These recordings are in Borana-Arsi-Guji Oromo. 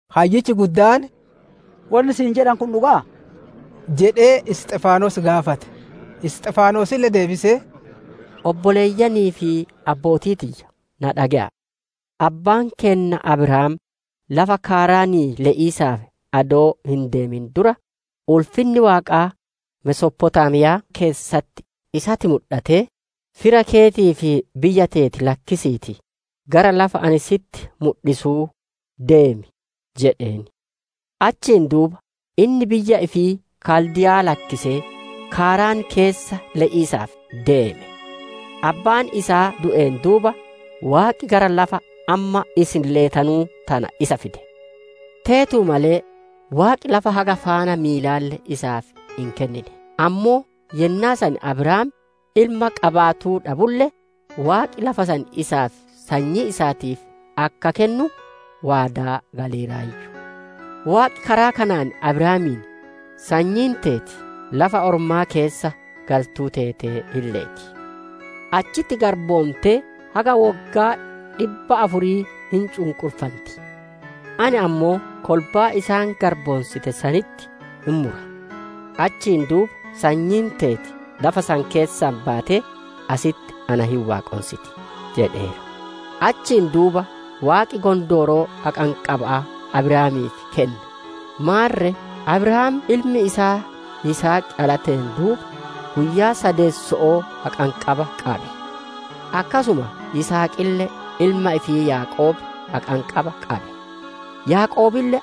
Hayyichi guddaan, «Wonni siin jedhanu kun dhuga'aa?» jedhee Isxifaanos gaafate. Isxifaanosille deebisee, «Obboleeyyanii fi abbootii tiyya, na dhage'a'a! Abbaan keenna Abrahaam lafa Kaaraanii le'iisaaf adoo hin deemin dura, ulfinni Waaqaa Mesophotaamiyaa keessatti isatti mudhatee, ‹Fira keetii fi biyya teeti lakkisiitii gara lafa ani si'itti mudhisuu deemi› jedheen. Achiin duuba inni biyya ifii Kaldiyaa lakkisee, Kaaraan keessa le'iisaaf deeme. Abbaan isaa du'een duuba, Waaqi gara lafa amma isin leetanu tanaa isa fide. Teetuu malee Waaqi lafa haga faana miilalle isaaf hin kennine; ammoo yennaa san Abrahaam ilma qabaatuu dhabulle, Waaqi lafa san isaa fi sanyii isaatiif akka kennu, waadaa galeeraayyu. Waaqi karaa kanaan Abrahaamiin, ‹Sanyiin teeti lafa ormaa keessa galtuu teetee hin leeti; achitti garboontee haga woggaa dhibba afurii hin cunqurfanti. Ani ammoo kolbaa isaan garboonsite sanitti hin mura; achiin duuba sanyiin teeti lafa san keessaa baatee asitti na hin waaqonsiti› jedheera. Achiin duuba Waaqi gondooroo haqanqaba'aa Abrahaamiif kenne; maarre Abrahaam ilmi isaa Yisihaq dhalateen duuba, guyyaa saddeetesso'oo haqanqabaa qabe; akkasuma Yisihaqille ilma ifii Yaaqoob haqanqabaa qabe; Yaaqoobille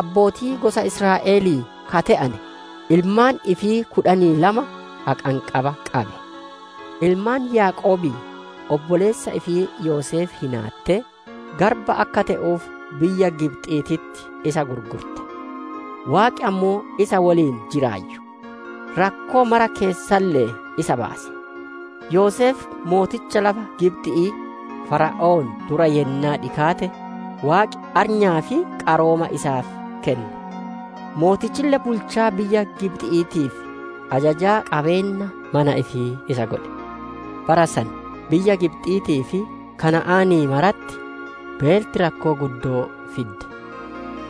abbootii gosa Israa'elii ka te'ane, ilmaan ifii kudhanii lama haqanqabaa qabe. «Ilmaan Yaaqoobii obboleessa ifii Yoseef hinaattee, garba akka te'uuf biyya Gibxiititti isa gurgurte; Waaqi ammoo isa woliin jiraayyu; rakkoo mara keessalle'ee isa baase. Yoseef mooticha lafa Gibxi'ii Fara'oon dura yennaa dhikaate, Waaqi arnyaa fi qarooma isaaf kenne; mootichille bulchaa biyya Gibxi'iitii fi ajajaa qabeenna mana ifii isa godhe. Bara san biyya Gibxi'iitii fi Kana'aanii maratti beelti rakkoo guddoo fidde;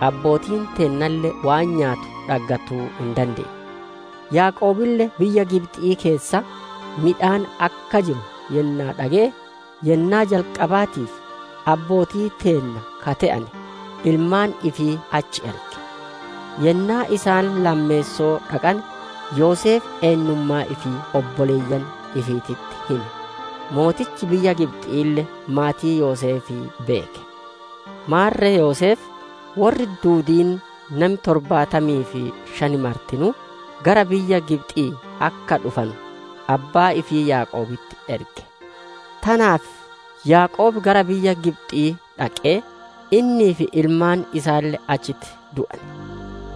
abbootiin teennalle waan nyaattu dhaggatuu hin dandeenne. Yaaqoobille biyya Gibxi'ii keessa midhaan akka jiru yennaa dhage'e, yennaa jalqabaatiif, abbootii teenna ka te'ane, ilmaan ifii achi erge. Yennaa isaan lammeessoo dhaqane, Yoseef eennummaa ifii obboleeyyan ifiititti hime; mootichi biyya Gibxi'iille maatii Yoseefii beeke. Maarre Yoseef, worri duudiin nami torbaatamii fi shan martinuu, gara biyya Gibxi'ii akka dhufanu, abbaa ifii Yaaqoobitti erge. Tanaaf Yaaqoob gara biyya Gibxi'ii dhaqee, innii fi ilmaan isaalle achitti du'ane.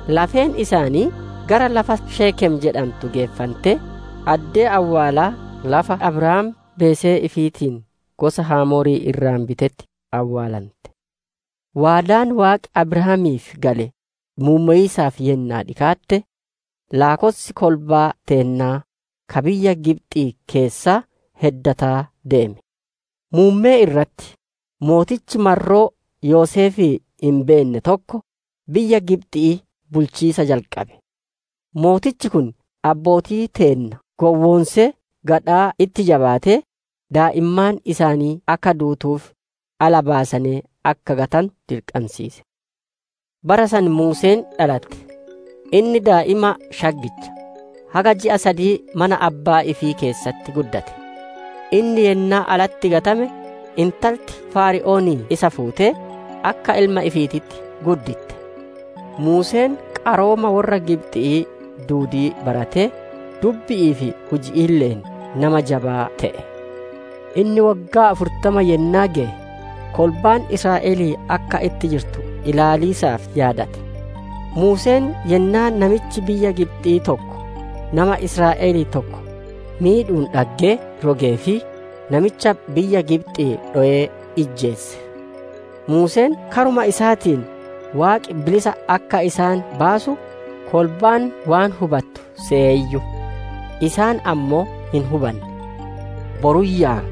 Lafeen isaanii gara lafa Sheekem jedhantu geeffantee, addee awwaalaa lafa Abrahaam beesee ifiitiin gosa Hamoorii irraa bitetti awwaalante. «Waadaan Waaqi Abrahaamiif gale muummowisaaf yennaa dhikaate, laakkossi kolbaa teennaa ka biyya Gibxii keessaa heddataa deeme. Muummee irratti, mootichi marroo Yoseefii hin beenne tokko biyya Gibxi'ii bulchiisa jalqabe. Mootichi kun abbootii teenna gowwoonsee gadhaa itti jabaatee, daa'immaan isaanii akka duutuuf, ala baasanee akka gatanu dirqansiise. Bara san Muuseen dhalate; inni daa'ima shaggicha; haga ji'a sadii mana abbaa ifii keessatti guddate. Inni yennaa alatti gatame, intalti Fara'oonii isa fuutee, akka ilma ifiititti gudditte. Muuseen qarooma worra Gibxi'ii duudii baratee dubbi'ii fi hujiile'een nama jabaa te'e. «Inni woggaa afurtama yennaa geye, kolbaan Israa'elii akka itti jirtu ilaaliisaaf yaadate. Muuseen yennaa namichi biyya Gibxi'ii tokko nama Israa'elii tokko miidhuun dhagge rogeefii, namicha biyya Gibxi'ii dhowee ijjeese. Muuseen karuma isaatiin Waaqi bilisa akka isaan baasu, kolbaan waan hubattu seyeeyyu; isaan ammoo hin hubanne. Boruyyaa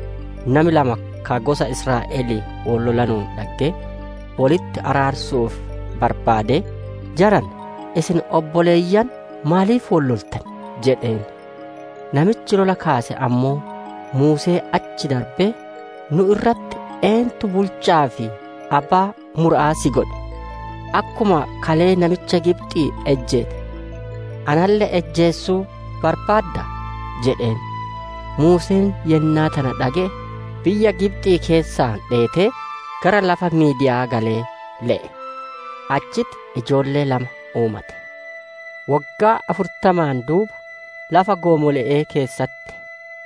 nami lama ka gosa Israa'elii wol lolanuun dhaggee, wolitti araarsiisaaf barbaadee, ‹Jarana, isin obboleeyyan; maaf wol loltan?› jedheen. Namichi lola kaase ammoo Muusee achi darbee, ‹Nu'u irratti eentu bulcha'aa fi abbaa mura'aa si godhe? Akkuma kalee namicha Gibxi'ii ijjeette, analle ijjeesuu barbaaddaa?› jedheen. Muuseen yennaa tana dhage'e, biyya Gibxi'ii keessaa dheetee, gara lafa Miidiya'aa galee le'e. Achitti ijoollee lama uumate. «Woggaa afurtamaan duuba, lafa goomole'ee keessatti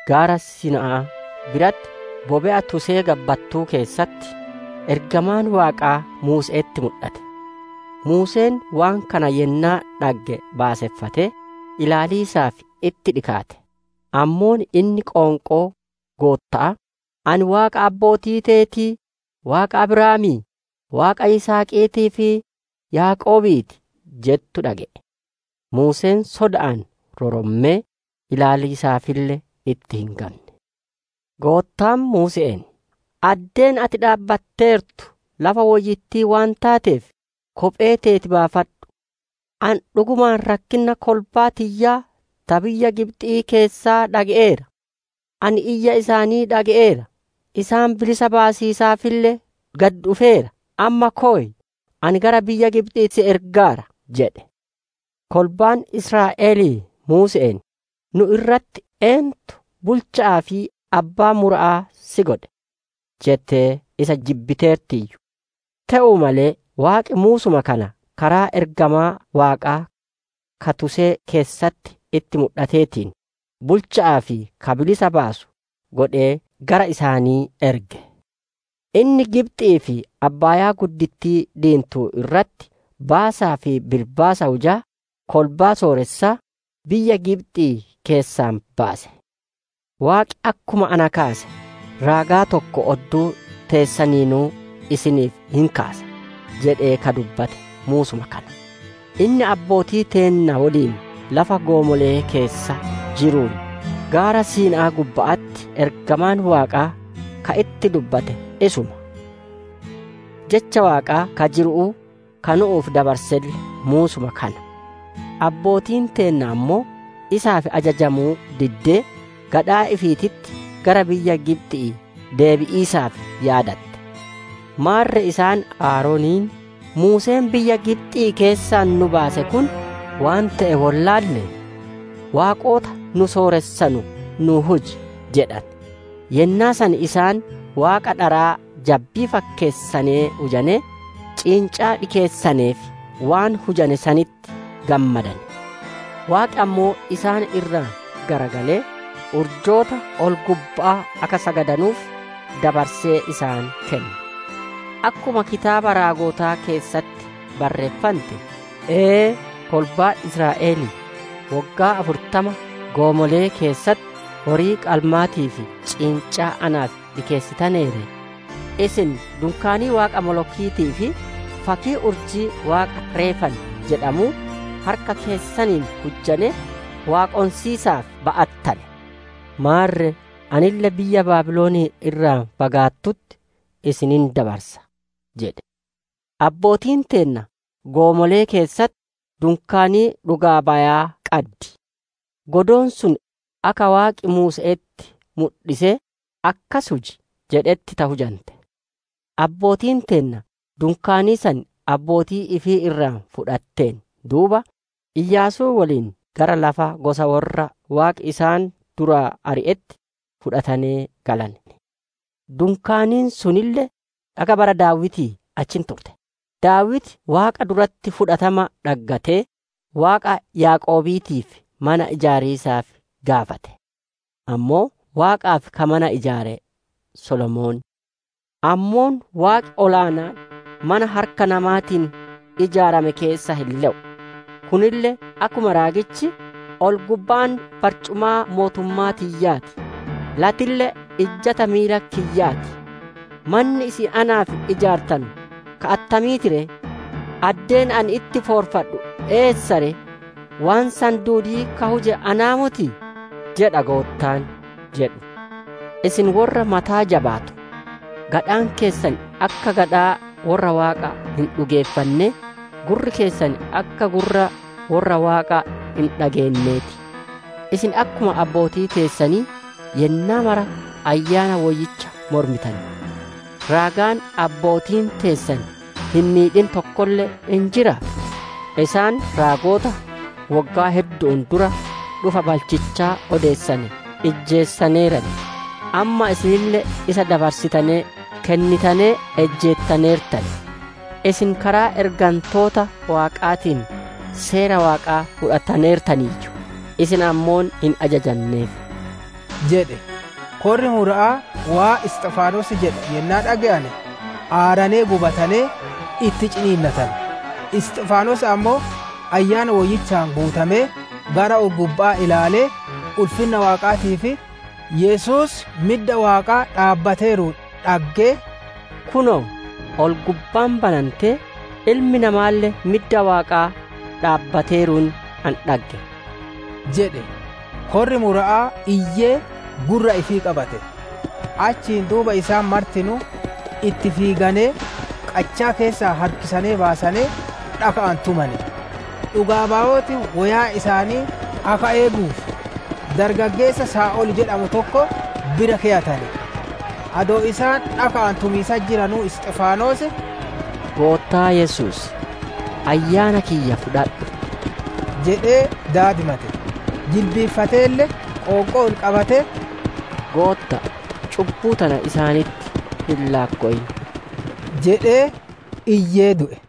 Gaara Siina'aa biratti bobe'a tusee gabbattuu keessatti, ergamaan Waaqaa Muuse'etti mudhate. Muuseen waan kana yennaa dhagge baaseffatee, ilaaliisaaf itti dhikaate. Ammoo inni qoonqoo Gootta'aa, ‹Ani Waaqa abbootii teetii, Waaqa Abrahaamii, Waaqa Yisihaqiitii fi Yaaqoobii ti› jettu dhage'e. Muuseen soda'aan rorommee, ilaaliisaafille itti hin gamne. Goottaan Muuse'een, ‹Addeen ati dhaabbatteertu lafa woyyittii waan teeteef, kophee teeti baafadhu. Ani dhugumaan rakkinna kolbaa tiyyaa ta biyya Gibxi'ii keessaa dhaggeera. Ani iyya isaanii dhage'eera; isaan bilisa baasiisaafille gad dhufeera. Amma koy; ani gara biyya Gibxi'ii si ergaara› jedhe. «Kolbaan Israa'elii Muuse'een, ‹Nu irratti eentu bulcha'aa fi abbaa mura'aa si godhe?› jettee isa jibbiteertiiyyu. Te'uu malee Waaqi Muusuma kana karaa ergamaa Waaqaa ka tusee keessatti itti mudhateetiin, bulcha'aa fi ka bilisa baasu godhee gara isaanii erge. Inni Gibxi'ii fi abbaayaa diintuu irratti baasaa fi bilbaasa hujaa, kolbaa sooressaa, biyya Gibxi'ii keessaa baase. ‹Waaqi akkuma na kaase, raagaa tokko odduu teessaniinuu isiniif hin kaasa› jedhe ka dubbate Muusuma kana. Inni abbootii teenna woliin lafa goomolee keessa jiruun, gaara Siinaa gubba'atti ergamaan Waaqaa ka itti dubbate isuma; Jecha Waaqaa ka jiru'uu ka nu'uuf dabarselle Muusuma kana. «Abbootiin teenna ammoo, isaaf ajajamuu diddee, gadhaa ifiititti gara biyya Gibxi'ii deebi'iisaaf yaadatte. Maarre isaan Aaroniin, ‹Muuseen biyya Gibxii keessaa nu baase kun waan te'e wollaallee, waaqota nu sooressanu nuu huji› jedhane. Yennaa san isaan waaqa dharaa jabbii fakkeessanee hujanee, ciincaa dhikeessaneef; waan hujane sanitti gammadane. Waaqi ammoo isaan irraa garagalee, urjoota ol-gubba'aa akka sagadanuuf dabarsee isaan kenne; akkuma kitaaba raagotaa keessatti barreeffante, «‹Ee, kolbaa Israa'elii! Woggaa afurtama goomolee keessatti horii qalmaatii fi ciincaa naaf dhikeessitanee ree? Isin dunkaanii waaqa molokiitii fi, fakkii urjii waaqa Reefaan jedhamuu, harka keessaniin hujjanee, waaqonsiisaaf ba'attane. Maarre anille biyya Baabilon irraa fagaattutti isin hin dabarsa› jedhe. «Abbootiin teenna goomolee keessatti dunkaanii dhugaa bayaa qaddi. Dunkaaniin sun akka Waaqi Muuse'etti mudhisee, ‹Akkas huji› jedhetti ta hujante. Abbootiin teenna dunkaanii san abbootii ifii irraa fudhatteen duuba, Iyaasuu woliin gara lafa gosa worra Waaqi isaan duraa ari'etti fudhatanee galane; dunkaaniin sunille haga bara Daawitii achi turte. Daawiti Waaqa duratti fudhatama dhaggatee, Waaqa Yaaqoobiitiif mana ijaariisaaf gaafate. Ammoo Waaqaaf ka mana ijaare Solomoon. «Ammoo Waaqi ol aanaan mana harka namaatiin ijaarame keessa hin le'u; kunille akkuma raagichi, «‹Ol-gubbaan barcumaa mootummaa tiyyaa ti; lattille ijjata miila kiyyaa ti. Manni isin naaf ijaartanu ka attamii ti ree? Addeen ani itti foorfadhu eessa ree? Waan san duudii ka huje anaa motii? jedha Goottaan› jedhe. «Isin worra mataa jabaatu! Gadhaan keessan akka gadhaa worra Waaqa hin dhugeeffannee, gurri keessan akka gurra worra Waaqa hin dhageennee ti. Isin akkuma abbootii teessanii yennaa mara Ayyaana Woyyicha mormitan. Raagaan abbootiin teessan hin miidhin tokkolle hin jiraa? Isaan raagota woggaa heddu'uun dura dhufa balchichaa odeessane ijjeesaneeran. Amma isinille isa dabarsitanee kennitanee ijjeettaneertan. Isin karaa ergantoota Waaqaatiin seera Waaqaa fudhattaneertaniiyyu; isin ammoo hin ajajanneef» jedhe. Korri Mura'aa waan Isxifaanos jedhe yennaa dhage'ane, aaranee gubatanee, itti ciniinnatane. Isxifaanos ammoo, Ayyaana Woyyichaan guutamee, gara ol-gubba'aa ilaalee, ulfinna Waaqaatii fi Yesuus midda Waaqaa dhaabbateeruun dhaggee, «Kunoo, ol-gubbaan banantee, Ilmi Namaalle midda Waaqaa dhaabbateeruun ani dhagge» jedhe. Korri Mura'aa iyyee gurra ifii qabate; achiin duuba isaan martinuu itti fiiganee, qachaa keessaa harkisanee baasanee, dhaka'aan tumane. Dhugaa bayooti woyaa isaanii akka eeguuf dargaggeessa Saa'ol jedhamu tokko bira keyatane. Adoo isaan dhaka'aan tumiisatti jiranuu, Isxifaanos, «Goottaa Yesuus, ayyaana kiyya fudhadhu» jedhee daadimate; jilbiiffateelle qoonqoo ol qabatee, «Gootta'a, cubbuu tana isaanitti hin laakkowin» jedhee iyyee, du'e.